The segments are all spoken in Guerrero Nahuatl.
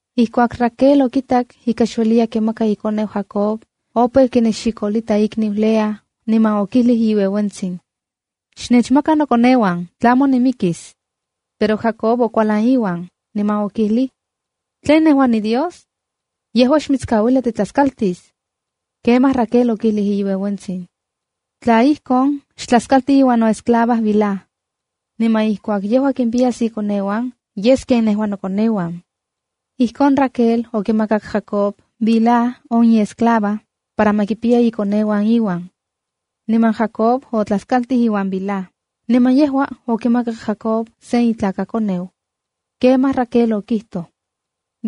Ijkuak Raquel okitak ika xueliya kimaka ikoneuan Jacob, opeu kinexikolita ikniu Lea, niman okijlij iueuentsin: —¡Xnechmaka nokoneuan tlamo nimikis! Pero Jacob okualan iuan, niman okijlij: —¿Tlen nejua niDios? Yejua xmitskauilia titlaskaltis. Kemaj Raquel okijlij iueuentsin: —Tla ijkon, xtlaskalti iuan noesclava Bilhá. Niman ijkuak yejua kimpiyas ikoneuan, yes ken nejua nokoneuan. Ijkon Raquel okimakak Jacob Bilhá, on iesclava, para ma kipiya ikoneuan iuan. Niman Jacob otlaskaltij iuan Bilhá, niman yejua okimakak Jacob sen itlakakoneu. Kemaj Raquel okijtoj: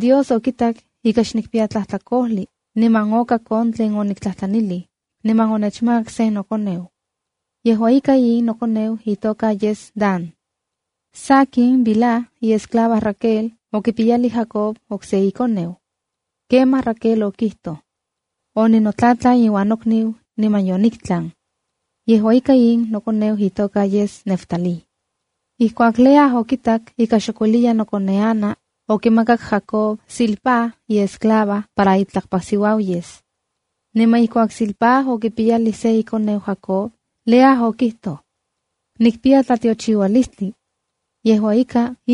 “Dios okitak ika xnikpiya tlajtlakojli, niman okak on tlen oniktlajtlanij, niman onechmakak sen nokoneu. Yejua ika, in nokoneu itoka yes Dana.” Sakin, Bilha, iesclava Raquel, okipiyalij Jacob okse ikoneu. Kemaj Raquel okijtoj: “Oninotlatlan iuan nokniu niman yoniktlan. Yejua ika, in nokoneu itoka yes Neftalíb.” Ijkuak Lea okitak ika xok ueliya nokoneana, okimakak Jacob Zilpá, iesclava, para itlakpasiuau yes. Niman ijkuak Zilpá okipiyalij se ikoneu Jacob, Lea okijtoj: “¡Nikpiya tlatiochiualistli! Yejua ika,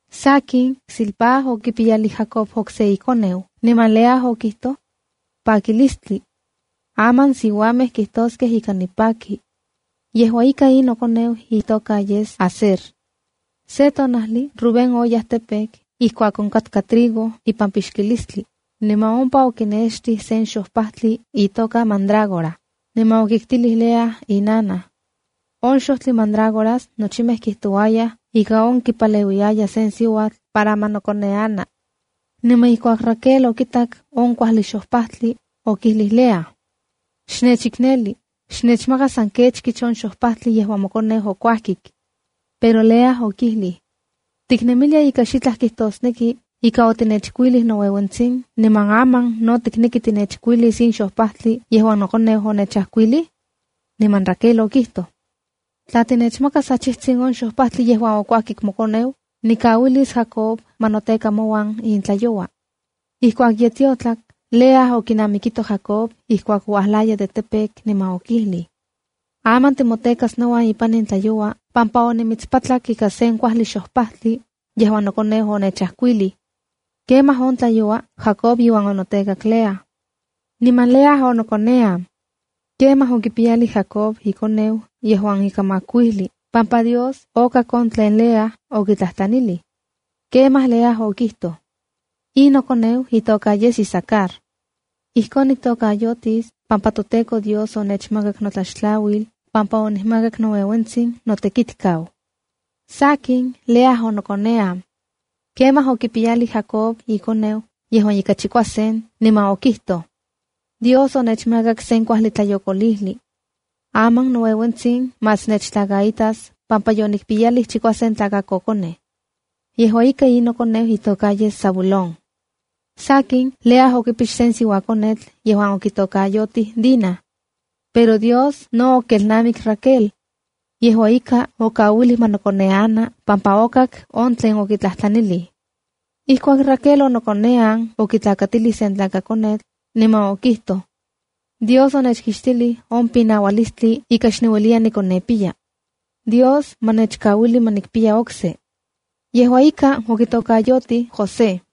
Sakin, Zilpá okipiyalij Jacob okse ikoneu, niman Lea okijtoj: “¡Pakilistli! Aman siuamej kijtoskej ika nipaki. Yejua ika, in nokoneu itoka yes Aserd.” Se tonajli Rubén oyaj campo ijkuak onkatka trigo ipan pixkilistli, niman ompa okinextij sen xojpajtli itoka mandrágora, niman okiktilij Lea on inanaj. (On xojtli mandrágoras nochimej kijtouayaj ika on kipaleuiya sen siuatl para ma nokoneana.) Niman ijkuak Raquel okitak on kuajli xojpajtli, okijlij Lea: —Xnechikneli, xnechmaka san kechkich on xojpajtli yejuan mokoneu okuajkik. Pero Lea okijlij: —¿Tiknemilia ika xitlaj kijtosneki ika otinechkuilij noueuentsin, niman aman no tikneki tinechkuilis in xojpajtli yejuan nokoneu onechajkuilij? Niman Raquel okijtoj: —Tla tinechmakas achijtsin ixojpajyo yejuan okuajkik mokoneu, nikauilis Jacob ma noteka mouan in tlayoua. Ijkuak ye tiotlak, Lea okinamikito Jacob ijkuak uajlaya de campo niman okijlij: —Aman timotekas nouan ipan in tlayoua pampa onimitspatlak ika sen kuajli xojpajtli yejuan nokoneu onechajkuilij. Kemaj on tlayoua Jacob iuan onotekak Lea. Niman Lea onokonean. Kemaj okipiyalij Jacob ikoneu yejuan ika makuijli pampa Dios okak on tlen Lea okitlajtlanilij. Kemaj Lea okijtoj: “In nokoneu itoka yes Isacare. Ijkon niktokayotis pampa toTEKO Dios onechmakak notlaxtlauil pampa onikmakak noueuentsin notekitkau.” Sakin, Lea onokonean. Kemaj okipiyalij Jacob ikoneu yejuan ika chikuasen, niman okijtoj: “Dios onechmakak sen kuajli tlayokolijli. Aman noueuentsin más nechtlakaitas pampa yonikpiyalij chikuasen tlakakokonej. Yejua ika, in nokoneu itoka yes Zabulónf.” Sakin, Lea okipix sen siuakonetl yejuan okitokayotij Dina. Pero Dios no okelnamik Raquel. Yejua ika, okauilij ma nokoneana pampa okak on tlen okitlajtlanilij. Ijkuak Raquel onokonean okitlakatilij sen tlakakonetl, niman okijtoj: “Dios onechkixtilij on pinaualistli ika xniueliya nikonepiyaya. Dios ma nechkauili ma nikpiya okse.” Yejua ika, okitokayotij Joség.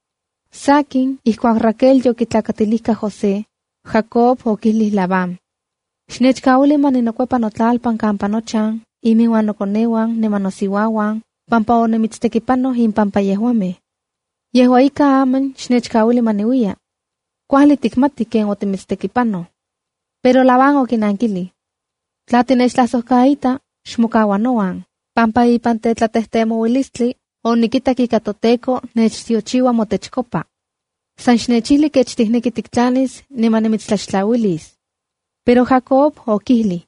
Sakin, ijkuak Raquel yokitlakatilijka José, Jacob okijlij Labán: —Xnechkauili ma ninokuepa notlalpan kampa nochan, inmiuan nokoneuan niman nosiuauan, pampa onimitstekipanoj impampa yejuamej. Yejua ika, aman xnechkauili ma niuiya. Kuajli tikmati ken onimitstekipanoj. Pero Labán okinankilij: —Tla tinechtlajsojkaita, xmokaua nouan, pampa ikan tetlatejtemoualistli onikitak ika toTEKO nechtiochiua motechkopa. San xnechijli kech tikneki tiktlanis niman nimitstlaxtlauilis. Kemaj Jacob okijlij: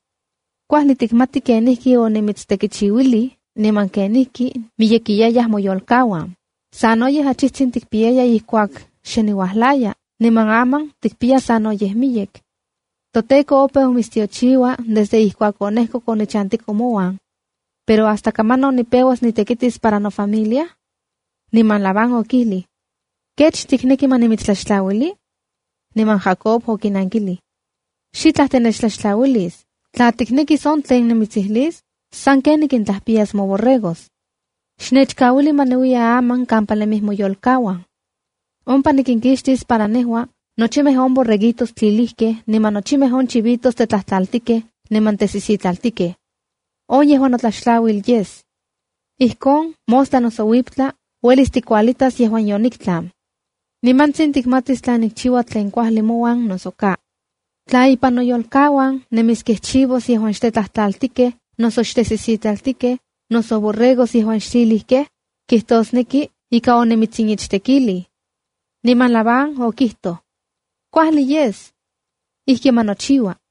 —Kuajli tikmati kenijkionimitstekichiuilij niman kenijkimiyekiyayaj moyolkauan. Sanoyej achijtsin tikpiyaya ijkuak xe niuajlaya niman aman tikpiya sanoyej miyek. ToTEKO opeu mitstiochiua desde ijkuak onejkok onichantiko mouan. Pero ¿Hasta kamanon nipeuas nitekitis para nofamilia? Niman Labán okijlij: —¿Kech tikneki ma nimitstlaxtlauili? Niman Jacob okinankilij: —Xitlaj tinechtlaxtlauilis. Tla tiknekis on tlen nimitsijlis, sanken nikintlajpiyas moborregos. Xnechkauili ma niuiya aman kampa nemij moyolkauan. Ompa nikinkixtis para nejua, nochimej on borreguitos tlilijkej niman nochimej on chivitos tetlajtlaltikej niman tesisitlaltikej. On yejua notlaxtlauil yes. Ijkon mostla noso uiptla, uelis tikualitas yejuan yoniktlan. Nimantsin tikmatis tla nikchiua tlen kuajli mouan noso ka. Tla ipan noyolkauan nemiskej chivos yejuan xtetlajtlaltikej noso xtesisitlaltikej, noso borregos yejuan xtlilijkej, kitosneki ika onimitsichtekilij. Niman Labán okijtoj: —Kuajli yes. Ijki ma nochiua.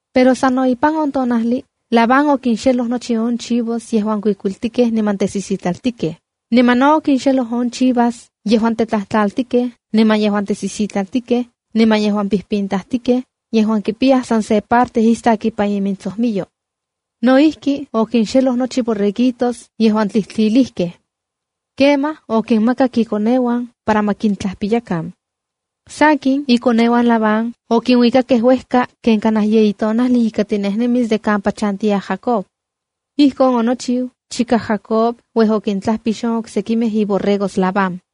Pero sano ipan on tonajli, Labán okinxeloj nochi on chivos yejuan kuikuiltikejh niman tesisitlaltikeji. Niman no okinxelo on chivas yejuan tetlajtlaltikej niman yejuan tesisitlaltikej niman yejuan pintajtikej (yejuan kipiyaj san se parte istak ipan intsojmiyo). No ijki, okinxeloj nochi borreguitos yejuan tlijtlilijkej. Kemaj, okinmakak ikoneuan para ma kintlajpiyakan. Sakin, ikoneuan Labán okinuikakej uejka ken kanaj yeyi tonajli ika tinejnemis de kampa chantiya Jacob. Ijkon onochiu chika Jacob uej okintlajpix on oksekimej iborregos Labán.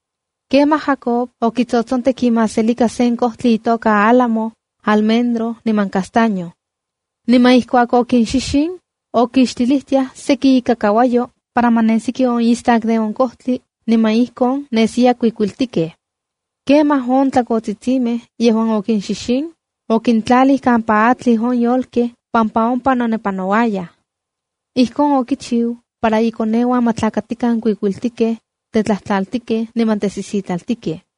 Kemaj Jacob okitsotsontek imaselika on kojtli álamo, almendro niman castaño. Niman ijkuak okinxixin, okixtilijtiaj seki ikakauayo para ma nesiki on istak de on kojtli niman ijkon nesiyaj kuikuiltikej. Kemaj on tlakotsitsimej yejuan okinxixin, okintlalij kampa atlij on yolkej pampa ompa nonepanouayaj. Ijkon okichiu para inkoneuan ma tlakatikan kuikuiltikej, tetlajtlaltikej niman tesisitlaltikej.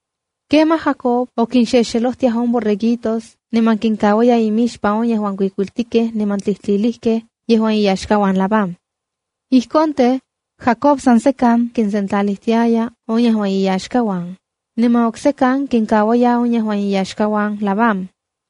Kemaj Jacob kinxelojtiaya on borreguitos niman kinkauaya imixpan on yejuan kuikuiltikej niman tlilijkej yejuan iyaxkauan Labán. Ijkon tej, Jacob san sekan kinsentlalijtiaya on yejuan iyaxkauan, niman oksekan kinkauaya on yejuan iyaxkauan Labán.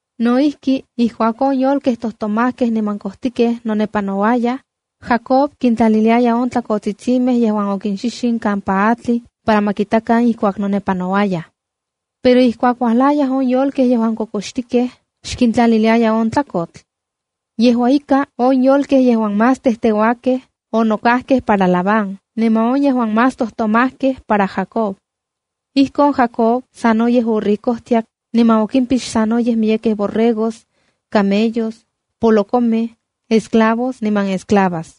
No ijki, ijkuak on yolkej yejuan tojtomajkej niman kojtikej nonepanouayaj, Jacob kintlaliliaya on tlakotsitsimej yejuan okinxixin kampa atlij para ma kitakan ijkuak nonepanouaj. Pero ijkuak uajlayaj on yolkej yejuan kokoxkitikej, xkintlaliliaya on tlakotl. Yejua ika, on yolkej yejuan más teuakej onokajkej para Labán niman on yejuan más tojtomajkej para Jacob. Ijkon Jacob sanoyej oricojtiak niman okimpix sanoyej miyekej borregos, camellos, polokomej, esclavos niman esclavas.